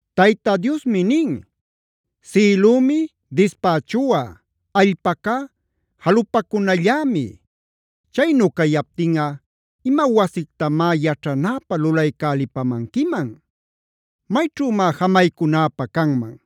Tayta Diosmi nin: “Sïlümi dispächuꞌa;a allpacá jalupacunallämi.b Chaynu cayaptinꞌa, ¿ima wasictamá yaćhanäpä lulaycälipamanquiman? ¿Mayćhümá jamaycunäpä canman?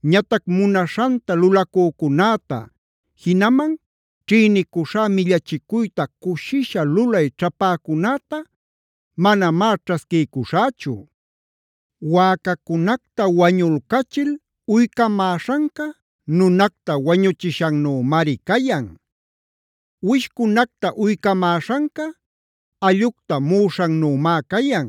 Ñatac munaśhanta lulacücunäta jinaman ćhïnicuśhá millachicuyta cushisha lulay ćhapäcunäta manamá ćhasquiycuśhächu; wäcacunacta wañulcachil uycamäśhanca, nunacta wañuchishannümari cayan. Uwishcunacta uycamäśhanca, allꞌucta muꞌuśhannümá cayan.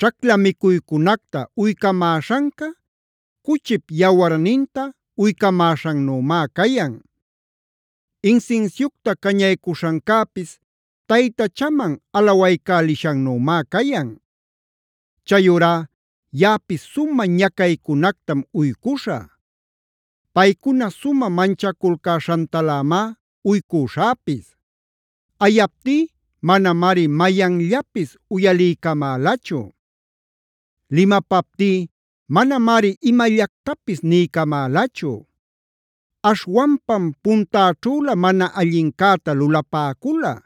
Ćhacla micuycunacta uycamäśhanca, cuchip yawarninta uycamäśhannümá cayan. Insinsiucta cañaycuśhancäpis taytachaman alawaycälishannümá cayan. Chayurá yaꞌapis sumä ñacaycunactam uycuśhä. Paycuna sumä manchaculcäśhantalämá uycuśhäpis. Ayaptí manamari mayanllapis uyaliycamälachu. Limapaptí manamari imallactapis niycamälachu. Aśhwanpam puntäćhülä mana allincäta lulapäcula;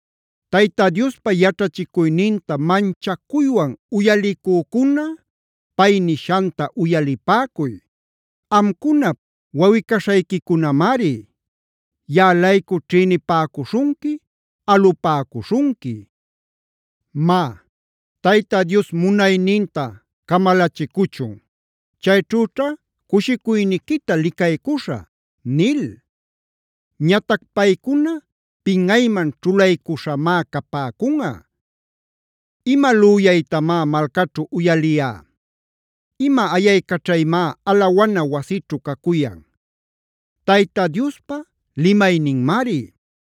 Tayta Diospa yaćhachicuyninta manchacuywan uyalicücuna pay nishanta uyalipäcuy: “Amcunap wawꞌi-caśhayquicunamari; yaꞌa-laycu ćhïnipäcuśhunqui, alupäcuśhunqui: ‘Má, Tayta Dios munayninta camalachicuchun; chayćhüćha cushicuyniquita licaycuśhä’ nil. Ñatac paycuna pinꞌayman ćhulaycuśhamá capäcunꞌa. ¿Ima lüyaytamá malcaćhu uyaliyá? ¿Ima ayaycaćhaymá alawana wasićhu cacuyan? Tayta Diospa limayninmari;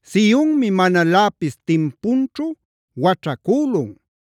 “Sionmi manaläpis timpunćhu waćhacülun;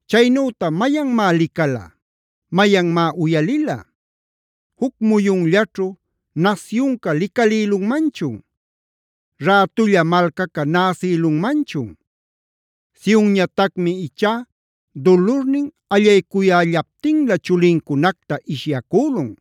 Caynüta ¿mayanmá licala? ¿Mayanmá uyalila? ¿Juc muyunllaćhu nasyunca licalïlunmanchun? ¿Rätulla malcaca näsïlunmanchun? Sionñatacmi ichá dulurnin allaycuyällaptinlä chulincunacta ishyacülun.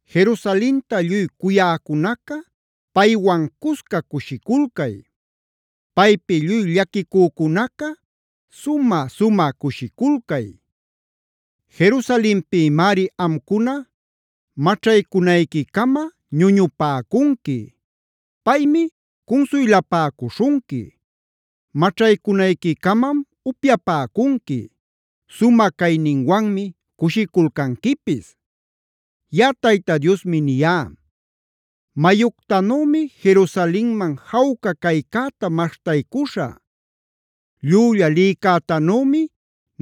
“Jerusalenta lluy cuyäcunaca, paywan cusca cushiculcay. Paypi lluy llaquicücunaca, sumä-sumä cushiculcay. Jerusalenpïmari amcuna maćhaycunayquicama ñuñupäcunqui. Paymi cunsuylapäcuśhunqui. Maćhaycunayquicamam upyapäcunqui; sumä cayninwanmi cushiculcanquipis. “Yaꞌa Tayta Diosmi niyá: Mayuctanümi Jerusalenman jawca caycäta maśhtaycuśhä. Llülla lïcätanümi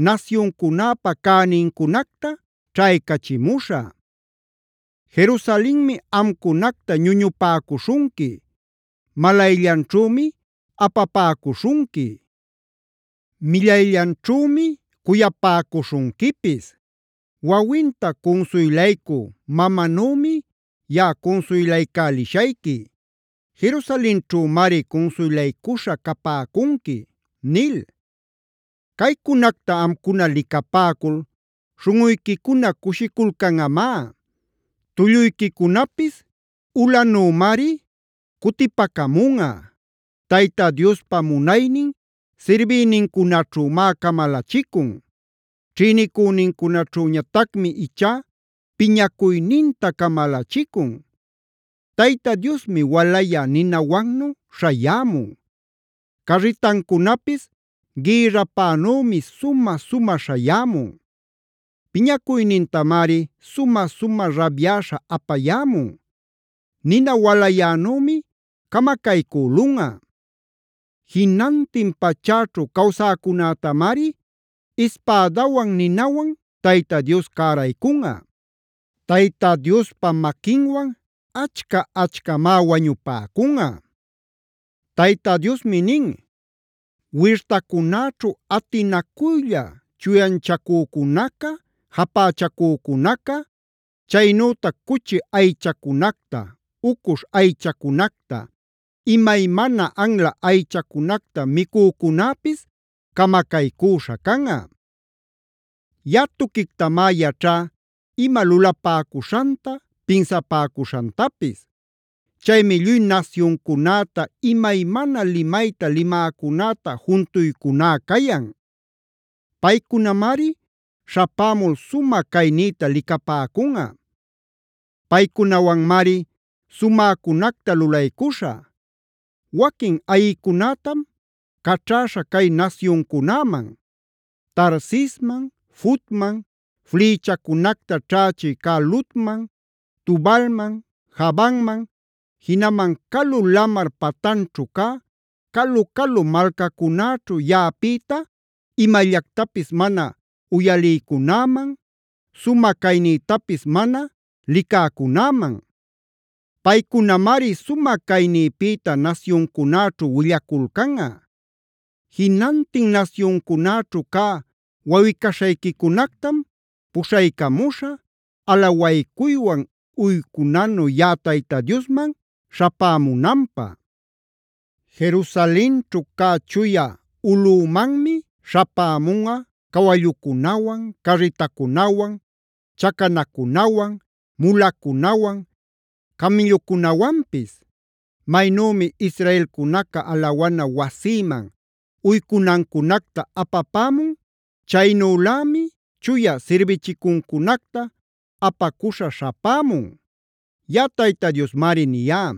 nasyuncunäpa cänincunacta ćhaycachimuśhä. Jerusalenmi amcunacta ñuñupäcuśhunqui; malayllanćhümi apapäcuśhunqui; millayllanćhümi cuyapäcuśhunquipis. Wawinta cunsuylacü mamanümi yaꞌa cunsuylaycälishayqui; Jerusalenćhümari cunsuylaycuśha capäcunqui” nil. Caycunacta amcuna licapäcul śhunꞌuyquicuna cushiculcanꞌamá; tulluyquicunapis ulanümari cutipacamunꞌa. Tayta Diospa munaynin sirbïnincunaćhümá camalachicun. Ćhïnicünincunaćhüñatacmi ichá piñacuyninta camalachicun. Tayta Diosmi walayä ninawannu śhayämun; carritancunapis gïrrapänümi sumä-sumä śhayämun. Piñacuynintamari sumä-sumä rabyäśha apayämun; nina walayänümi camacaycülunꞌa. Jinantin pachäćhu cawsäcunätamari ispädawan ninawan Tayta Dios cäraycunꞌa. Tayta Diospa maquinwan achca-achcamá wañupäcunꞌa. Tayta Diosmi nin: “Wirtacunäćhu atinacuylla chuyanchacücunaca japächacücunaca, chaynütac cuchi aychacunacta, ucuśh aychacunacta, imaymana anla aychacunacta micücunäpis camacaycüśha canꞌa. “Yaꞌa tuquictamá yaćhá ima lulapäcuśhanta, pinsapäcuśhantapis. Chaymi lluy nasyuncunäta, imaymana limayta limäcunäta juntuycuná cayan; paycunamari śhapämul sumä caynïta licapäcunꞌa. Paycunawanmari sumäcunacta lulaycuśhä; waquin ayïcunätam caćhäśha cay nasyuncunäman: Tarsisman, Futman, flïchacunacta ćhächï cä Ludman, Tubalman, Javanman, jinaman calu lamar patanćhu cä calu-calu malcacunäćhu yaꞌapïta imallactapis mana uyalïcunäman, sumä caynïtapis mana licäcunäman. Paycunamari sumä caynïpïta nasyuncunäćhu willaculcanꞌa. Jinantin nasyuncunäćhu cä wawꞌi-caśhayquicunactamh puśhaycamuśhä, alawaycuywan uycunanu yaꞌa Tayta Diosman śhapämunanpä. Jerusalenćhu cä chuya ulꞌümanmi śhapämunꞌa cawallucunawan, carritacunawan, chacanacunawan, mulacunawan, camïllucunawanpis. Maynümi israelcunaca alawana wasïman uycunancunacta apapämun, chaynülämi chuya sirbichicuncunacta apacuśha śhapämun. Yaꞌa Tayta Diosmari niyá.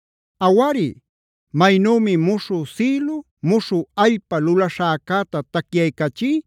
“Awari, maynümi muśhü sïlu, muśhü allpai lulaśhäcäta tacyaycachí,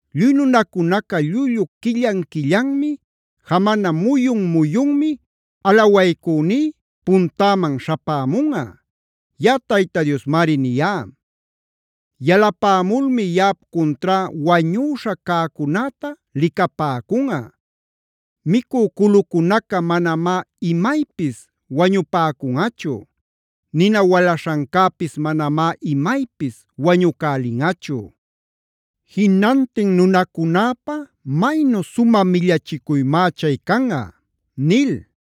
Lluy nunacunaca llullu quillan-quillanmi, jamana muyun-muyunmi alawaycüní puntäman śhapämunꞌa. Yaꞌa Tayta Diosmari niyá. Yalapämulmi yaꞌap cuntrá wañüśha cäcunäta licapäcunꞌa. Micü culucunaca manamá imaypis wañupäcunꞌachu; nina walaśhancäpis manamá imaypis wañucälinꞌachu.k Jinantin nunacunäpä maynu sumä millachicuymá chay canꞌa” nil.